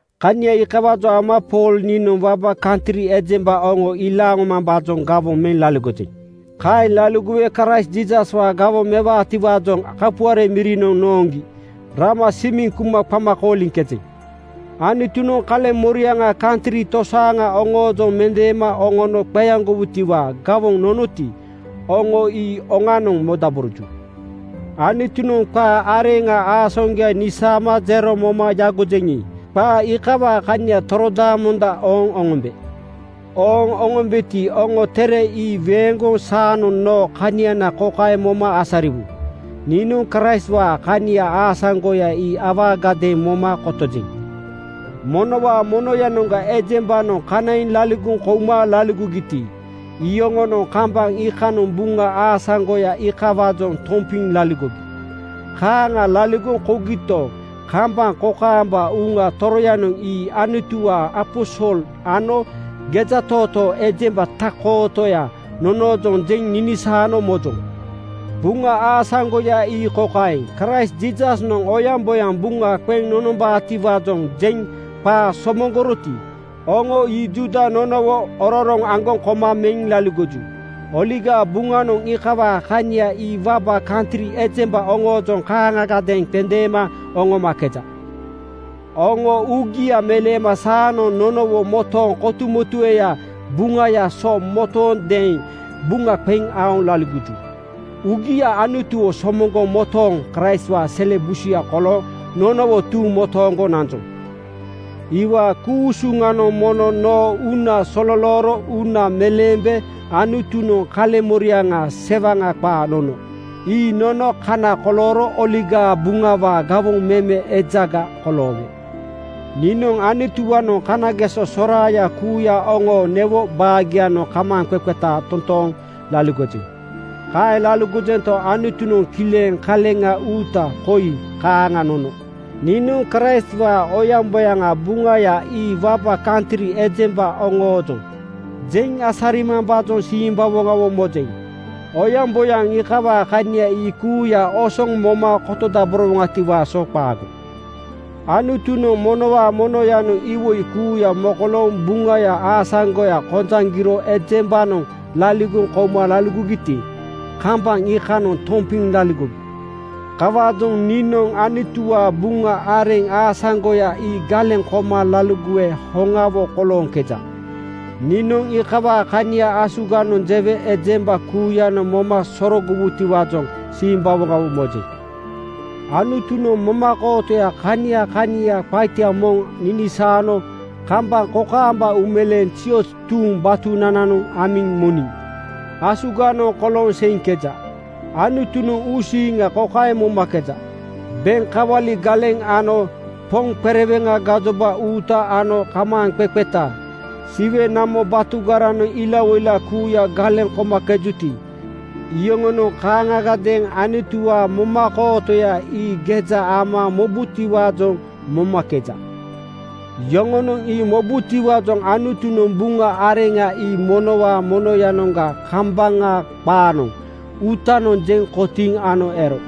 Kania iikawaajoŋ ama Pool niinoŋ waba kantri ejemba oŋo ilaaŋ oŋomambaajoŋ gawoŋ meŋ laligojeŋ. Kaeŋ laligowe Kraist Jiisaswaa gawoŋ mewetiwaajoŋ kapuare mirinoŋ nooŋgi rama simiŋ kuma qama kooliŋkejeŋ. Anutunoŋ kaleŋmoriaŋa kantri tosaaŋa oŋoojoŋ mendeema oŋono qeaŋgowutiwaa gawoŋ nonoti, oŋo ii oŋanoŋ modaboroju. Anutunoŋ qaa areŋa aasaŋgoya nisaama jero moma yagojeŋi, qaa iikawaa kania torodaamonda ooŋ oŋombe. Ooŋ oŋombeti, oŋo tere ii weeŋgoŋ saanoŋ noo kaniana kokaeŋ moma asariwu: Niinoŋ Kraistwaa kania aasaŋgoya ii awaagadeeŋ moma kotojeŋ. Monowaa monoyanoŋga ejembanoŋ kanaiŋ laligoŋ kouma laligogiti, iyoŋonoŋ kambaŋ iikanoŋ Buŋa aasaŋgoya iikawaajoŋ tompiŋ laligogi. Kaaŋa laligoŋ kougito, kambaŋ kokaamba Uŋa Toroyanoŋ ii Anutuwaa aposol ano gejatootoo ejemba tak-kootoya nonoojoŋ jeŋ ninisaano mojoŋ. Buŋa aasaŋgoya ii kokaeŋ: Kraist Jiisasnoŋ oyaŋboyaŋ buŋa qeŋ nonombaatiwaajoŋ jeŋ qaa somoŋgoroti, oŋo ii Juuda nonowo ororoŋ aŋgoŋ koma meŋ laligoju. Oligaa Buŋanoŋ iikawaa kania ii waba kantri ejemba oŋoojoŋ kaaŋagadeeŋ qendeema oŋomakeja. Oŋo uugia meleema saanoŋ nonowo motooŋ kotumotueyaa Buŋaya so motoondeeŋ buŋa qeŋ aoŋ laligoju. Uugia Anutuwo somoŋgoŋ motooŋ Kraistwaa sele busuya kolooŋ nonowo tuuŋ motooŋgo nanjoŋ. Iwaa ku-usuŋanoŋ mono noo uuna sololooro uuna meleembe Anutunoŋ kaleŋmoriaŋa sewaŋa qaa nono. Ii nono kana kolooro Oligaa Buŋawaa gawoŋ meme ejaga koloowe. Niinoŋ Anutuwaanoŋ kanageso soraaya kuuya oŋoo newo baagianoŋ kamaaŋqeqeta totooŋ laligojeŋ. Kaeŋ laligojento, Anutunoŋ kileŋ kaleŋa uuta koi kaaŋa nono: Niinoŋ Kraistwaa oyaŋboyaŋaa Buŋaya ii waba kantri ejemba oŋoojoŋ jeŋ asarimambaajoŋ simbawoŋawo mojeŋ. Oyaŋboyaŋ iikawaa kania ii kuuya osoŋ moma kotodaborowoŋatiwaa so qaago. Anutunoŋ monowaa monoyanoŋ iwoi kuuya mokolooŋ Buŋaya aasaŋgoya kojaŋgiro ejembanoŋ laligoŋ kouma laligogiti, kambaŋ iikanoŋ tompiŋ laligogi. Kawaajoŋ niinoŋ Anutuwaa Buŋa areŋ aasaŋgoya ii galeŋ koma laligowe hoŋawo kolooŋkeja. Niinoŋ iikawaa kania asuganoŋ jewe ejemba kuuyanoŋ moma sorogowutiwaajoŋ simbawoŋawo mojeŋ. Anutunoŋ momakootoya kania kania qaita moŋ ninisaano kambaŋ kokaamba uumeleeŋ zioz tuuŋ batunananoŋ amiŋ moniŋ asuganoŋ kolooŋ seiŋkeja. Anutunoŋ uusiiŋa kokaeŋ momakeja: Beŋ kawali galeŋ ano poŋ qereweŋa gajoba uuta ano kamaaŋqeqeta Siwe namo batugaranoŋ ilawoila kuuya galeŋ komakejuti, iyoŋonoŋ kaaŋagadeeŋ Anutuwaa momakootoya ii geja ama mobutiwaajoŋ momakeja. Yoŋonoŋ ii mobutiwaajoŋ Anutunoŋ Buŋa areŋa ii monowaa monoyanoŋga kambaŋa qaanoŋ uutanoŋ jeŋ kotiiŋ ano ero.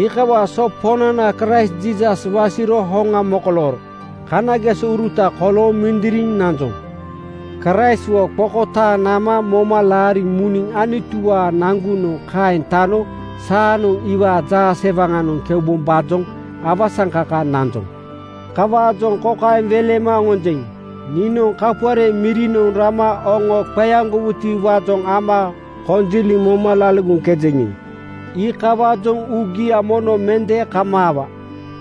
Iikawaa so Poŋnana Kraist Jiisas wasiro hoŋa mokolooro kanagesouruta kolooŋ mindiriŋ nanjoŋ. Kraistwo qokotaaŋ nama moma laariŋ muniŋ Anutuwaa nagu-noŋ kaeŋ tano saanoŋ iwaa jaasewaŋanoŋ keubombaajoŋ awasaŋkaka nanjoŋ. Kawaajoŋ kokaeŋ welema oŋonjeŋ: “Niinoŋ kapuare mirinoŋ rama oŋo qeaŋgowutiwaajoŋ ama konjiliŋ moma laligoŋkejeŋi, iikawaajoŋ uugia mono mende kamaawa.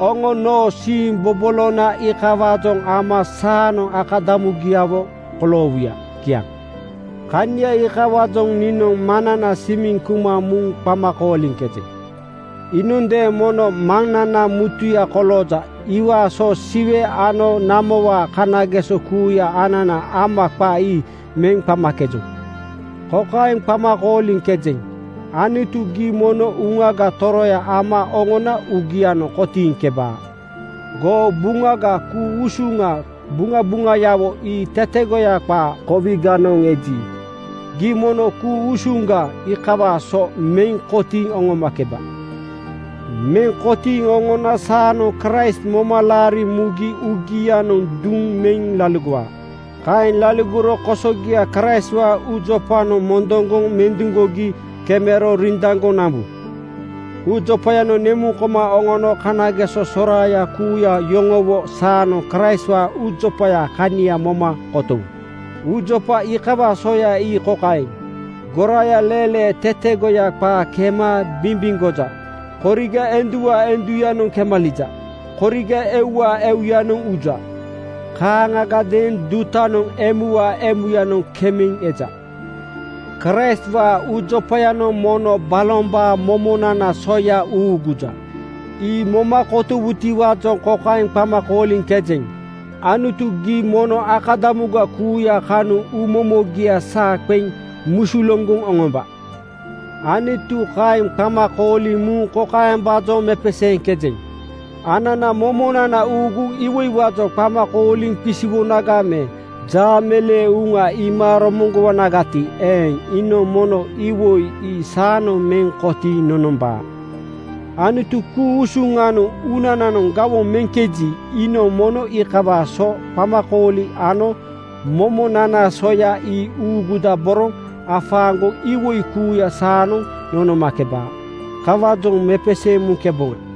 Oŋo noo siimbobolona iikawaajoŋ ama saanoŋ akadamugiawo koloowuya.” Kiaŋ. Kania iikawaajoŋ niinoŋ Maŋnana simiŋ kuma muŋ qama kooliŋkejeŋ. Iinondeeŋ mono maŋnana mutuya kolooja. Iwaa so Siwe ano namowaa kanageso kuuya anana ama qa ii meŋ qamakejoŋ. Kokaeŋ qama kooliŋkejeŋ, “Anutu, gii mono Uŋaga Toroya ama oŋona uugianoŋ kotiiŋkebaa. Goo Buŋaga ku-usuŋa buŋabuŋayawo ii tetegoya qaa kowiganoŋ eji, gii mono ku-usuŋga iikawaa so meŋ kotiiŋ oŋomakeba. Meŋ kotiiŋ oŋona saanoŋ Kraist moma laariŋ mugi uugianoŋ duŋ meŋ laligowaa. Kaeŋ laligoro kosogia Kraistwaa uujopanoŋ mondoŋgoŋ menduŋgogi kemero rindaŋgoŋ nambu. Uujopayanoŋ nemuŋ koma oŋono kanageso soraaya kuuya yoŋowo saanoŋ Kraistwaa uujopayaa kania moma kotowu. Jopagoŋ nonomakeji, uujopa iikawaa soya ii kokaeŋ: Goraaya leelee tetegoya qaa kema bimbimgoja. Koriga enduwaa enduyanoŋ kemalija. Koriga euwaa euyanoŋ uja. Kaaŋagadeeŋ dutanoŋ emuwaa emuyanoŋ kemeŋ eja. Kraistwaa uujopayanoŋ mono balombaa momonanaa soya uuguja. Ii moma komuwutiwaajoŋ kokaeŋ qama kooliŋkejeŋ: “Anutu, gii mono akadamuga kuuya kanoŋ uumomogia saa qeŋ musuluŋgoŋ oŋomba.” Anutu kaeŋ qama kooliŋ muŋ kokaembaajoŋ mepeseeŋkejeŋ: Anana momonana uuguŋ iwoiwaajoŋ qama kooliŋ qisiwonaga me jaameleeŋ uŋa iima romoŋgowonagati eeŋ, iinoŋ mono iwoi ii saanoŋ meŋ kotiiŋ nonombaa. Anutu ku-usuŋanoŋ uunananoŋ gawoŋ meŋkeji, iinoŋ mono iikawaa so qamakooli ano momonanaa soya ii uugudaboroŋ afaaŋgoŋ iwoi kuuya saanoŋ nonomakebaa. Kawaajoŋ mepeseeŋ muŋkeboŋa.